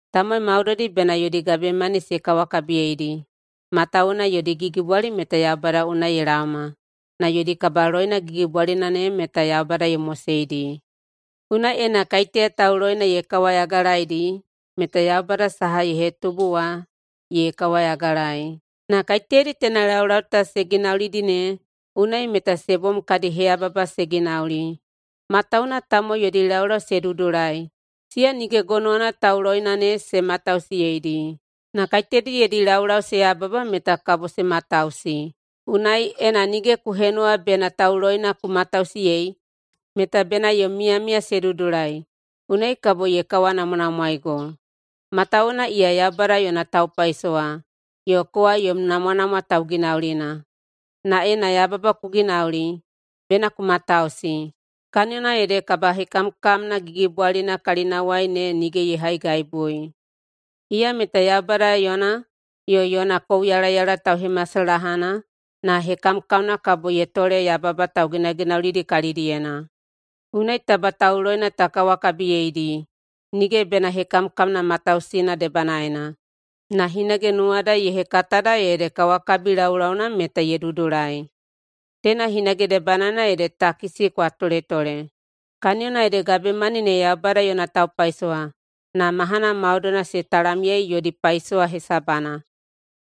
Tamowai maudoidi bena yodi gabemani se kawakabiyeidi, matawuwuna yodi gigibwali meta Yaubada unai ye laoma na yodi kabaloina gigibwalina ne meta Yaubada ye moseidi. Unai ena kaiteya tauloina ye kawayagalaeidi meta Yaubada saha ye hetubu wa ye kawayagalaei. Na kaiteyadi teina laulau ta se ginaulidi ne, unai meta se bom kadi heyababa se ginauli. Matawuwuna tamowai yodi laulau se dudulai, siya nige gonowana tauloina ne se matausiyeidi. Na kaiteyadi yodi laulau se yababa meta kabo se matausi. Unai, ena nige ku henuwa bena tauloina ku matausiyei meta bena yom miyamiya se dudulai, unai kabo ye kawanamwanamwaeigo. Matawuwuna iya Yaubada yona taupaisowa yo kowa yom namwanamwa tauginaulina. Na ena yababa ku ginauli, bena ku matausi, kaniyona ede kabahekamkamna gigibwalina kalinawai ne nige ye haigaibui. Iya meta Yaubada yona, yo yona kouyalayala tauhemasalahana, na hekamkamna kabo ye tole yababa tauginaginaulidi kalidiyena. Unai taba tauloina ta kawakabiyeidi, nige bena hekamkamna matausiyeina debanaena, na hinage nuwada ye hekatada ede kawakabi laulauna meta ye dudulai. Teina hinage debanaena ede takisi kwa toletole, kaniyona ede gabemani ne Yaubada yona taupaisowa na mahana maudoina se talamyei yodi paisowa hesabana.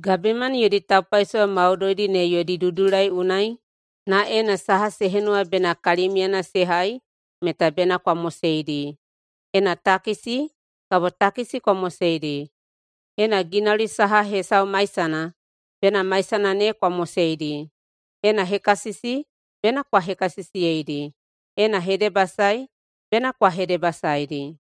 Gabemani yodi taupaisowa maudoidi ne yodi dudulai unai na ena saha se henuwa bena kalimiuyena se hai meta bena kwa moseidi. Ena takisi, kabo takisi kwa moseidi. Ena ginauli saha hesau maisana, bena maisana ne kwa moseidi. Ena hekasisi, bena kwa hekasisiyeidi. Ena hedebasae, bena kwa hedebasaeidi.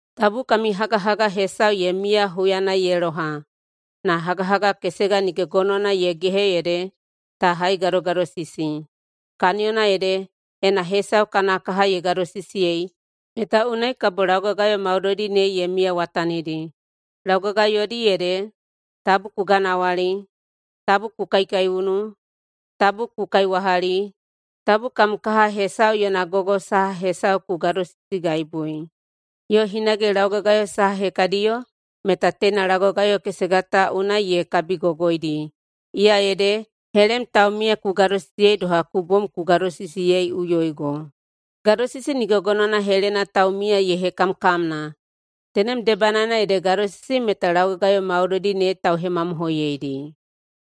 Tabu kami hagahaga hesau ye miya huyana ye loha, na hagahaga kesega nige gonowana ye gehe ede ta haigadogadosisi. Kaniyona ede, ena hesau kana kaha ye gadosisiyei, meta unai kabo laugagayo maudoidi ne ye miyawatanidi. Laugagayodi ede, “Tabu ku ganawali,” “Tabu ku kaikaiunu,” “Tabu ku kaiwahali,” “Tabu kam kaha hesau yona gogo saha hesau ku gadosisigaibui,” yo hinage laugagayo saha hekadiyo, meta teina laugagayo kesega ta unai ye kabigogoidi, iya ede, “Helem taumiya ku gadosisiyei doha ku bom ku gadosisiyeiꞌuyoigo.” Gadosisi nige gonowana helena taumiya ye hekamkamna. Tenem debanaena ede gadosisi meta laugagayo maudoidi ne tauhemamohoiyeidi.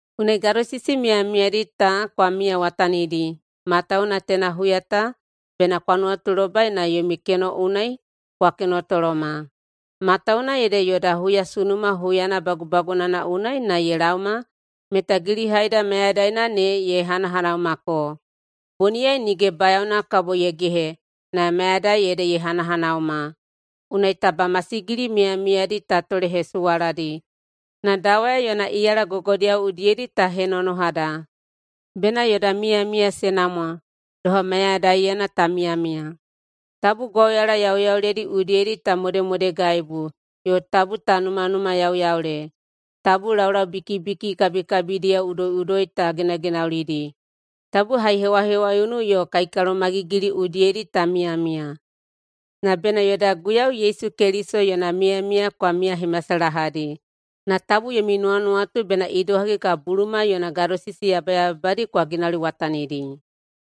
Unai gadosisi miyamiyadi ta kwa miyawatanidi, matawuwuna teina huya ta bena kwa nuwatulobai na yomi keno unai kwa kenotoloma. Matawuwuna ede yoda huyasunuma huyana bagubagunana unai na ye laoma meta gilihaida mayadaina ne ye hanahanaumako. Boniyai nige bayaona kabo ye gehe na mayadai ede ye hanahanauma. Unai taba masigili miyamiyadi ta tolehesuwaladi na dawaya yona iyala gogodiyao udiyedi ta henonohada. Bena yoda miyamiya se namwa doha mayadaiyena ta miyamiya. Tabu gwauyala yauyauledi udiyedi ta modemodegaibu yo tabu ta numanumayauyaule, tabu laulaubikibiki kabikabidiyao udoiꞌudoi ta ginaginaulidi, tabu haihewahewaiunu yo kaikalomagigili udiyedi ta miyamiya. Na bena yoda Guiyau Yesu Keliso yona miyamiya kwa miyahemasalahadi na tabu yomi nuwanuwatu bena idohagi kabo buluma yona gadosisi yabayababadi kwa ginauliwatanidi.